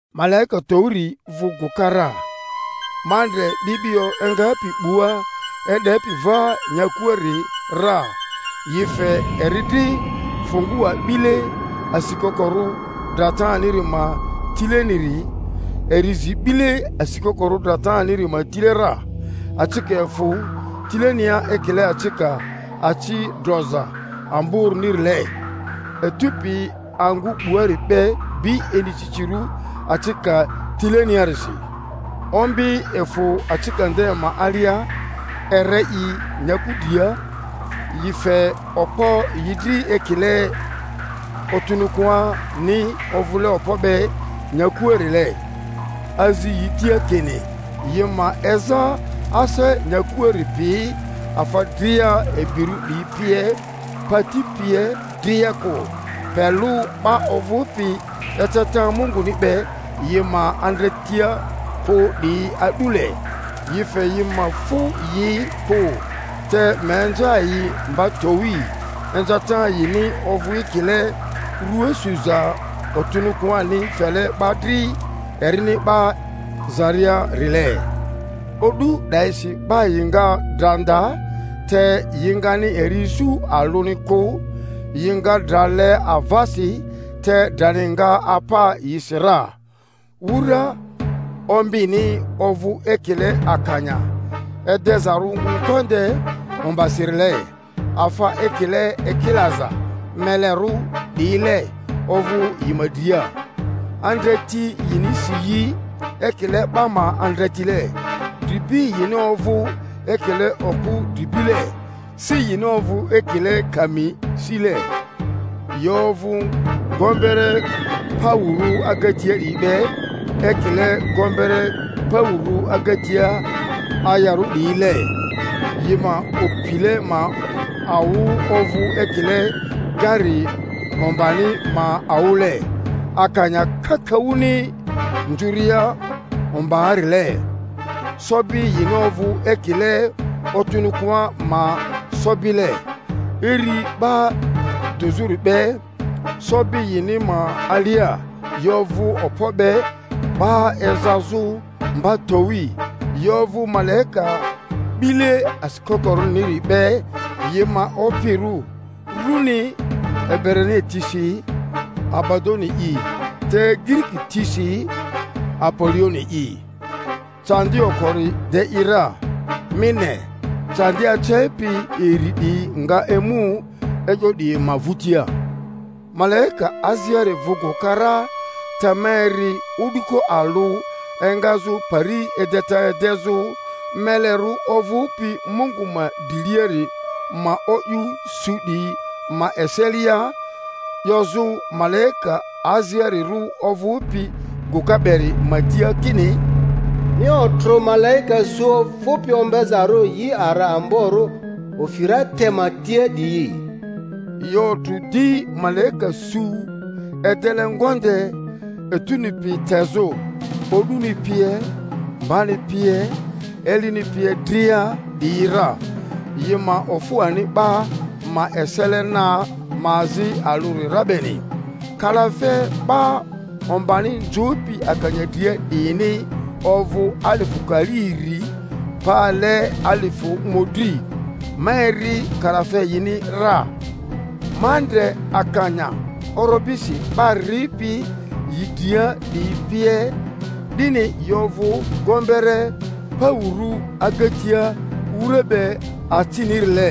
Malaika towiri vᴜ gᴜka ra, ma ndre 'bi'bio engapi 'bua e'depi va nyakuari ra, yi fe eri dri fungua 'bile asikokorᴜ drataniri ma tileniri; eri zi 'bile asikokorᴜ drataniri ma tile ra, acika efᴜ tilenia ekile acika aci droza amborᴜnirile, etu pi angᴜ 'buari be bi inicicirᴜ acika tileniarisi. Ombi efᴜ acika nde ma alia, ere yi nyaku dria, yi fe okpo yi dri ekile otᴜnᴜkᴜani ovᴜle okpo be nyakuarile; azi yi tia kini yi ma eza ase nyakuari pi, afa dria ibirᴜ 'diyi pie, pati pie dria kᴜ, pe lᴜ 'ba ovᴜpi eceta Munguni be yi ma andretia kᴜ 'diyi a'dule; yi fe yi ma fu yi kᴜ, te ma inza yi mba towi, inzata yini ovᴜ ekile rua suza otᴜnᴜkᴜani fele 'ba dri erini 'ba zariarile. O'du 'dayisi 'ba yi nga dra nda, te yi ngani eri isu alᴜni kᴜ; yi nga dra le avasi, te drani nga apa yisi ra. Wura ombini ovᴜ ekile akanya edezarᴜ ngonde ombasirile; afa ekile ekilaza melerᴜ 'diyile ovᴜ yi ma dria; andreti yini si yi ekile 'ba ma andretile, dribi yini ovᴜ ekile okᴜ dribile, si yini ovᴜ ekile kami sile; yi ovᴜ gombere paᴜrᴜ agatia 'diyi be ekile gombere paᴜrᴜ agatia ayarᴜ 'diyile, yi ma opile ma awᴜ ovᴜ ekile gari ombani ma awᴜle, akanya kakaᴜni nzᴜria ombaarile; sobi yini ovᴜ ekile otᴜnᴜkᴜa ma sobile, iri 'ba dᴜzᴜri be, sobi yini ma alia yi ovᴜ okpo be 'ba ezazᴜ mba towi. Yi ovᴜ malaika 'bile asikokorᴜniri be yi ma opirᴜ; rᴜni Ebrania tisi Abadoni'i, te Giriki tisi Apolioni'i, Candi okori de i ra; mi ne, candi acepi iri 'diyi nga emu e'yo 'diyi ma vᴜtia. Malaika aziari vᴜ gᴜka ra, te ma eri o'duko alᴜ engazᴜ pari edeta edezᴜ melerᴜ ovᴜpi Mungu ma driliari ma o'yᴜ su 'diyi ma eselia, 'yozᴜ malaika aziarirᴜ ovᴜpi gᴜka beri ma tia kini, Mi otrᴜ malaika su ovᴜpi ombezarᴜ yi ara amborᴜ Ufirate ma tia 'diyi. Yi otrᴜ di malaika su edele ngonde etuni pi tezᴜ, o'duni pie, mbani pie, elini pie dria 'diyi ra, yi ma ofu ani 'ba ma esele na ma azi alᴜri ra beni. Kalafe 'ba ombani nzᴜpi akanya dria 'diyini ovᴜ alifᴜ kali iri pale alifᴜ mᴜdri; ma eri kalafe yini ra. Ma ndre akanya orobisi: 'ba ripi yi dria 'diyi pie 'dini, yi ovᴜ gombere paᴜrᴜ agatia wura be acinirile,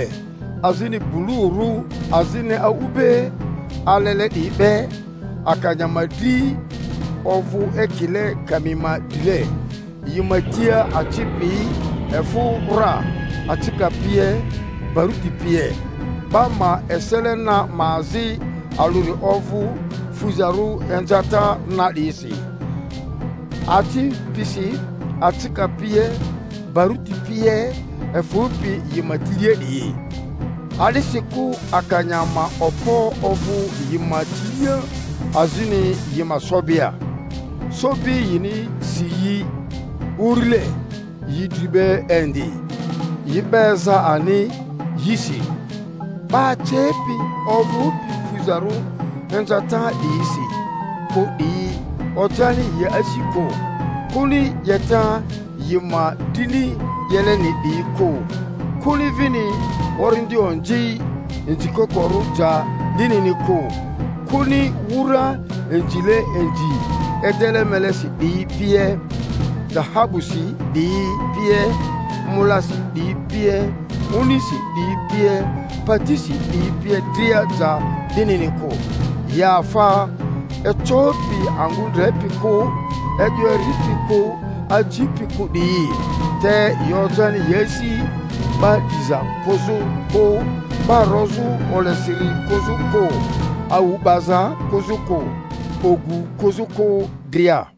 azini blurᴜ, azini a'ugbe alele 'diyi be, akanya ma dri ovᴜ ekile kami ma drile, yi ma tia aci pi efᴜ ra, acika pie, baruti pie. 'Ba ma esele na ma azi alᴜri ovᴜ fuzarᴜ inzata na 'diyisi, aci pisi, acika pie, baruti pie efᴜpi yi ma tilia 'diyi. A'disikᴜ akanya ma okpo ovᴜ yi ma tilia azini yi ma sobia; sobi yini si yi urile, yi dri be indi, yi 'ba eza ani yisi. 'Ba acepi ovᴜpi fuzarᴜ inzata 'diyisi kᴜ 'diyi ojani yi asi kᴜ, kᴜni 'yeta yi ma drini 'yeleni 'diyi kᴜ, kᴜni vini orindi onzi inzikokorᴜ ja 'dinini kᴜ, kᴜni wura inzile inzi edele melesi 'diyi pie, dahabusi 'diyi pie, molasi 'diyi pie, onisi 'diyi pie, patisi 'diyi pie dria ja 'dinini kᴜ, yi afa ecopi angᴜ ndrepi kᴜ, e'yo eripi kᴜ, acipi kᴜ 'diyi; te yi ojani yi asi 'ba 'diza kᴜzᴜ kᴜ, 'ba rozᴜ olesiri kᴜzᴜ kᴜ, awu 'baza kᴜzᴜ kᴜ, ogu kᴜzᴜ kᴜ dria.